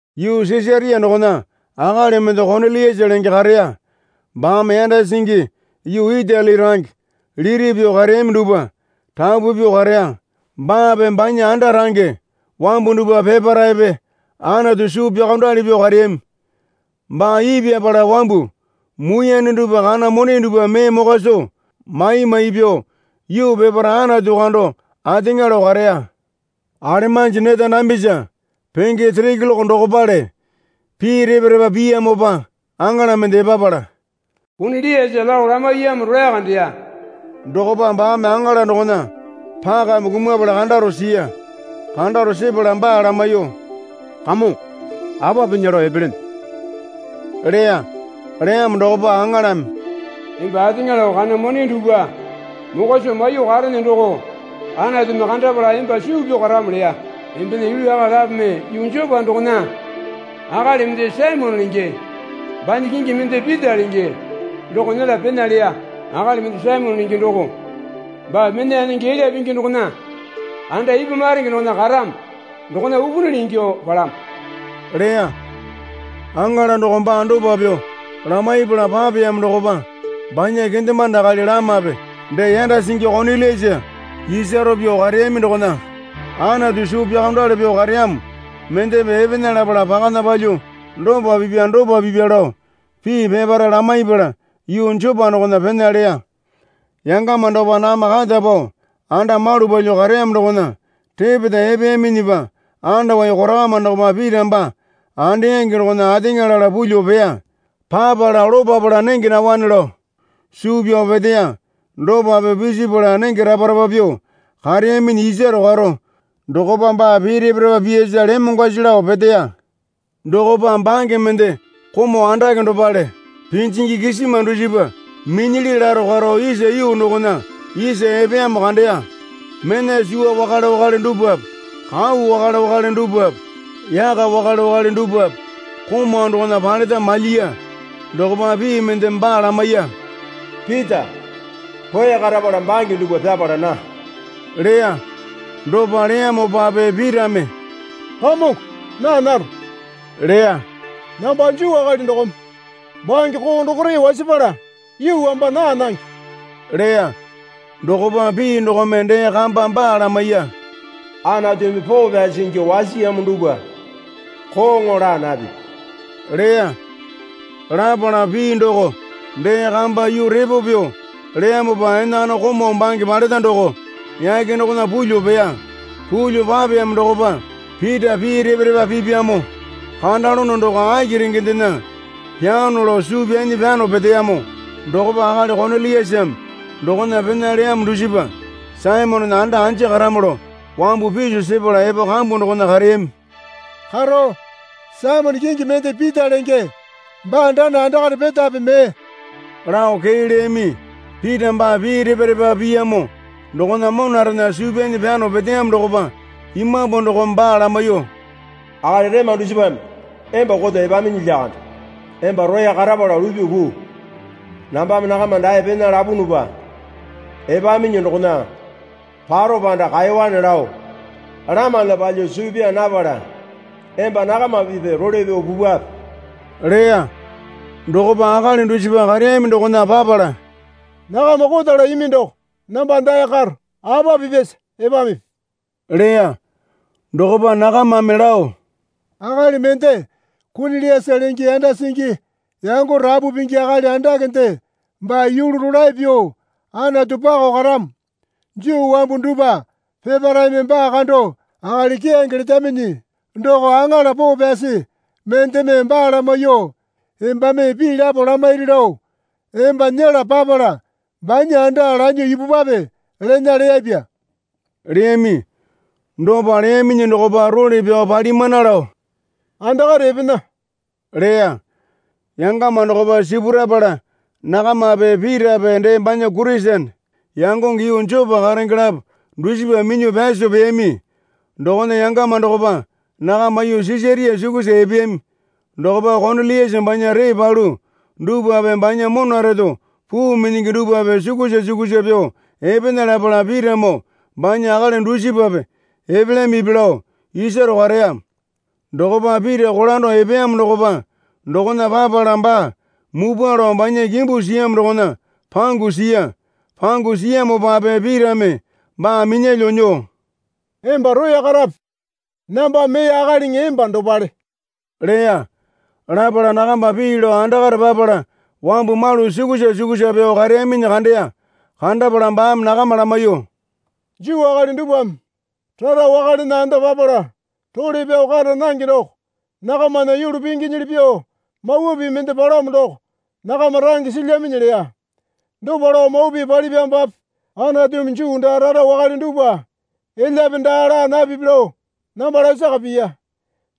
Yuu Sisaria dokona akali mende Koniliasa lenge kareya. Baame yanda singi yuu Itali range liti pyuo kareyami dupwa rapu pyuo kareya. Baape banya anda range wambu dupwa peparepe Anatu suu pyaokondali pyuo kareyami. Baa ipyapala wambu muiyane dupwa kana mone dupwa mee mokwa soo maimai pyuo, yuu peparae Anatu kando ateŋa lao kareya. Alemanji neta dambisa penge sere keloke dokopale pii repa repa piyamopa aŋala mende epapala, Koniliasa lao lamaiyamo rolae kandeya. Dokopa baame aŋala dokona pakame kumapala kandaro siya. Kandaro sepala baa lamaiyuo, Kamongo, apa pinya lao epelene? leya. Leyamo dokopa aŋalame, Emba ateŋa lao kana mone dupwa mokwa soo maiyuo karene doko Anatumi kandapala emba suu pyao karamo leya. Embena yulu akali lapome yuu Jopa dokona akali mende Saimone lenge banya kingi mende Pita lenge doko nyela pena leya. Akali mende Saimone lenge doko baa mena yanenge elya pingi dokona anda ipwa maronge dokona karamo dokona upunili ingyuo palamo leya. Aŋala doko baa dopa pyuo lamaipala papeyamo dokopa banya kendemande akali lamape dee yanda singi Koniliasa isaro pyuo kareyami dokona Anatu suu pyaokondali pyuo kareyamo mendepe epena lapala pakana palyuo dopa pipya dopa pipya lao pii peparae lamaipala yuu Jopa dokona pena leya. Yangama dokopa nakama kata pao anda malu palyuo kareyamo dokona repeta epeyaminyipa andawai korakama dokopa Pita baa andeyangi dokona ateŋa lala pulyuo peya. Papala lopapala nenge naowane lao suu pyao peteya. Dopa pyuo pisipala nenge rapa rapa pyuo kareyaminyi isaro karo dokopa baa pii repa repa piyasa lemongwasi lao peteya. Dokopa bange mende komau andake dopale pinjingi kisima dusipa minyili laro karo isa yuu dokona isa epeyamo kandeya. Mena suwa wakale wakale dupwape kau wakale wakale dupwape yaka wakale wakale dupwape komau dokona paleta malyiya. Dokopa pii mendeme baa lamaiya. Pita, roya karapala bange dupwa pyapala naa leya. Dopa leyamopape Pitame, Kamongo naa naro leya. Namba Juu akali dokome bange koo dokore wasapala yuu wamba naa nange leya. Dokopa pii dokome dee kamba baa lamaiya. Anatumi poo pyasi ingyuo wasiyamo dupwa kooŋo laa napipi leya. Lapala pii doko dee kamba yuu repo pyuo leyamopa enakana komau bange paleta doko yake dokona pulyuo peya. Pulyo papeyamo dokopa Pita pii repa repa pipyamo kandalono doko aki rengendena pyaano lao suu pyanyi pyano peteyamo dokopa akali Koniliasame dokona pena leyamo dusipa Saimonena anda anja karamo lao wambu piso sepala epo kambu dokona kareyami. Karo, Saimone kingi mende Pita lenge baa dana andakare petape mee? lao kee leyami. Pita baa pii repa repa piyamo dokona monarena suu pyanyi pyano peteyamo dokopa Imambu dokome baa lamaiyuo, Akali rema dusipame emba koto epaminyi lyakande. Emba roya karapala lupyuo puu. Nambame nakama dae pena lapunupa epaminyi dokona paro panda kaewane lao lamana palyuo suu pyaa napala emba nakama pipya role pyao pupwape leya. Dokopa akali dusipa kareyami dokona papala, Nakama kotala imi doko namba dae karo. Apa pipyasa epamipi? leya. Dokopa nakamame lao, Akali mende Koniliasa lenge yanda singi yango rapu pingi akali andakende baa yulu rolae pyuo Anatu pakao karamo. Juu wambu dupwa peparaeme baa kando akali keyange letaminyi doko aŋala poo pyasi mendeme baa lamaiyuo, Embame pii lapo lamairi lao emba nyela papala banya anda lanyuo ipupwape lena leyapya, leyami. Dopa leyaminyi dokopa role pyao palimana lao andakare epena leya. Yangama dokopa sipurapala nakamape Pitape dee banya Kurisene yangonge yuu Jopa karenge lapo dusipa minyuo pyaso peyami. Dokona yangama dokopa nakama yuu Sisaria sukusa epeyami. Dokopa Koniliasa banya ree palu dupwape banya mona reto puu minyingi dupwape sukusa sukusa pyuo epena lapala Pitamoo banya akali dusipape epelyamipi lao isaro kareya. Dokopa Pita kolando epeyamo dokopa dokona papala baa mupwa lao banya kimbu siyamo dokona pangu siya. Pangu siyamopape Pitame baa minyalyuo nyuo, Emba roya karape. Namba mee akaliŋi emba dopale, leya. Lapala nakamba pii lao andakare papala wambu malu sukusa sukusa pyuo kareyaminyi kandeya. Kandapala baame nakama lamaiyuo, Juu akali dupwame rara wakalena anda papala role pyao kara nange doko nakamana yulu pinginyili pyuo mawa pii mende palamo doko nakama range silyaminyi leya. Dopa lao mawa pii palipyamopape Anatumi Juu daa rara wakale dupwa elyape daa laa napipi lao namba lasaka piya.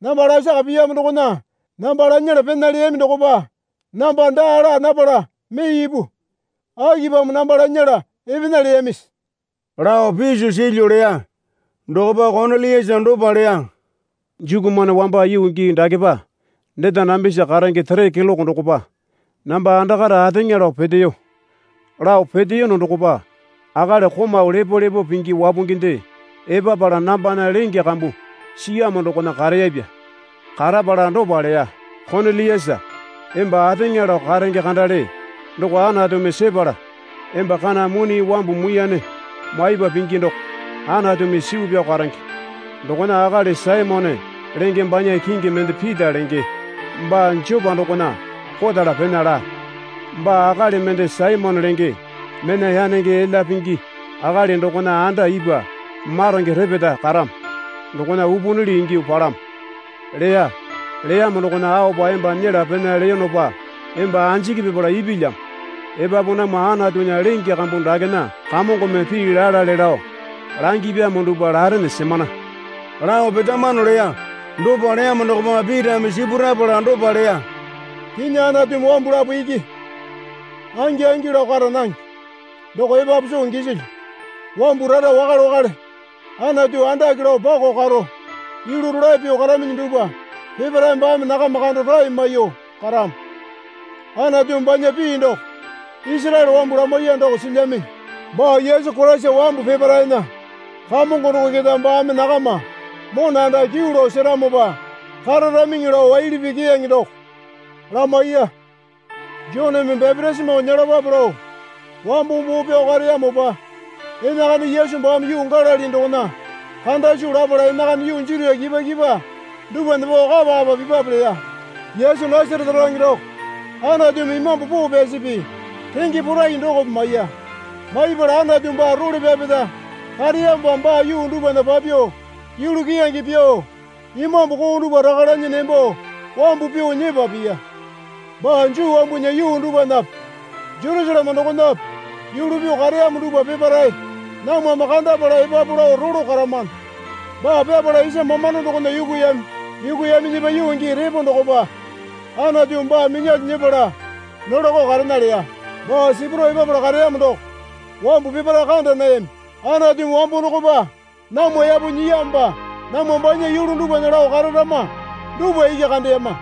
Namba lasaka piyamo dokona namba lanyala pena leyami dokopa namba daa laa napala mee ipu. Akipamo namba lanyala epena leyamisi? lao piso silyu, leya. Dokopa Koniliasa dopa leya. Jukumane wamba yuu gii dakepa neta dambisa karenge sere keloke dokopa namba andakare ateŋa lao peteyo. Lao peteyono dokopa akali komau lepolepo pingi wapunginde epapala nambana lenge kambu siyamo dokona kareyapya. Karapala dopa leya. Koniliasa, emba ateŋa lao karenge kandale doko Anatumi sepala, emba kana mone wambu muiyane maipa pingi doko Anatumi suu pyao karenge. Dokona akali Saimone lenge banya kingi mende Pita lenge baa Jopa dokona kotala pena laa. Baa akali mende Saimone lenge mena yanenge elya pingi akali dokona anda ipwa maronge repeta karamo dokona upunili ingyuo palamo leya. Leyamo dokona aopa emba nyela pena leyonopa emba anjiki pipala ipilyamo. Epapu namwa Anatunya lenge kambu dakena Kamongome pii lalale lao langipyamo dupwa larene semana lao petamano leya. Dopa leyamo dokopa Pitame sipurapala dopa leya. Kinyi Anatumi wambu lapo iki angi angi lao kara nange, doko epapu soo gisilyu. Wambu rara wakale wakale Anatu andake lao pako karo yulu rolae pyuo karaminyi dupwa peparae baame nakama kando rae maiyuo karamo. Anatumi banya pii doko Isaraele wambu lamaiya doko silyaminyi. Baa Yesu Koraisa wambu peparaena Kamongo doko keta baame nakama mona anda kyuu lao seramopa kararaminŋi lao waili pii keyange doko lamaiya. Joneme bapitisimo nyelapape lao wambo boo pyao kareyamopa enakana Yesu baame yuu Galili dokona kanda soo lapala enakana yuu Jutia kipwa kipwa dupwana pao kapa kapa pipape leya. Yesu Nasarete range doko Anatumi Imambu Poo Pyasipi renge porai dokope maiya. Maiyapala Anatu baa role pyapeta kareyamopa baa yuu dupwana papyuo yulu keyange pyuo imambu koo dupwa raka lanyi nembo wambu pyuo nyepa piya. Baa Juu wambunya yuu dupwanape Jerusaleme dokonape yulu pyuo kareyamo dupwa peparae namwame kandapala epapu lao rolo karamano. Baa pyapala isa mamando dokona yukuyami. Yukuyaminyipa yuu gii repo dokopa Anatumi baa minyalyuo nyepala nolako karena leya. Baa sipurao epapala kareyamo doko wambu peparae kanda nayami. Anatumi wambo dokopa namwa yapo nyiyamopa namwa banya yulu dupwana lao kararama dupwa iki kandeyama.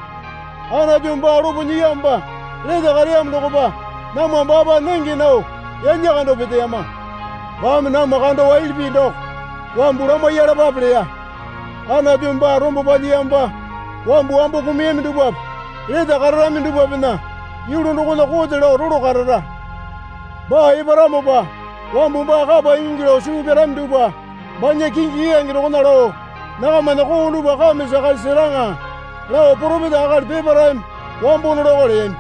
Anatumi baa lopo nyiyamopa lete kareyamo dokopa namwa baapa nenge nao yalya kando peteyama. Baame namwa kando waili pii doko wambu lamaiyalapape leya. Anatumi baa rombo palyiyamopa wambu wambo kumuyami dupwape lete kararami dupwapena yulu dokona kote lao rolo karara. Baa eparamopa wambu baa kapa ingingi lao suu pyarami dupwa banya kingi keyange dokona lao nakamana koo dupwa kame sakasi seraŋa lao poropeta akali peparaeme wambo nolako leyami.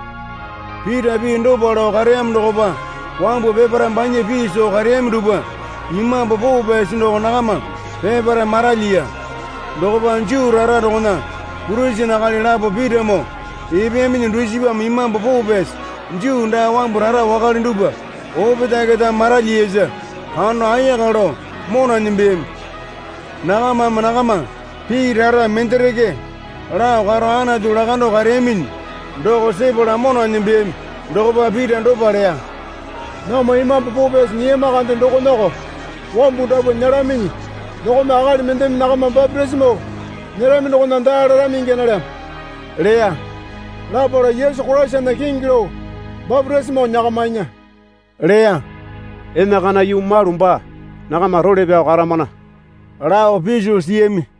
Pita pii dopa lao kareyamo dokopa wambu peparae banya pii soo kareyami dupwa Imambu Poo Pyasi doko nakama peparae maralyiya. Dokopa Juu rara dokona Kurisene akali lapo Pitamoo epeyaminyi dusipame Imambu Poo Pyasi Juu daa wambu rara wakale dupwa opetae keta maralyiyasa kando ayaka lao mona nembeyami. Nakamame nakama pii rara mendereke lao karo Anatu lakando kareyaminyi doko sepala mona nembeyami. Dokopa Pita dopa leya. Namwa Imambu Poo Pyasi nyiyama kande dokonako wambu dapwa nyelaminyi dokome akali mendeme nakama bapitisimo nyerami dokona daa larami ingya nalyamo leya. Lapala Yesu Koraisana kingi lao bapitisimo nyakamainya leya. Enakana yuu malu baa nakama role pyao karamana lao piso siyami.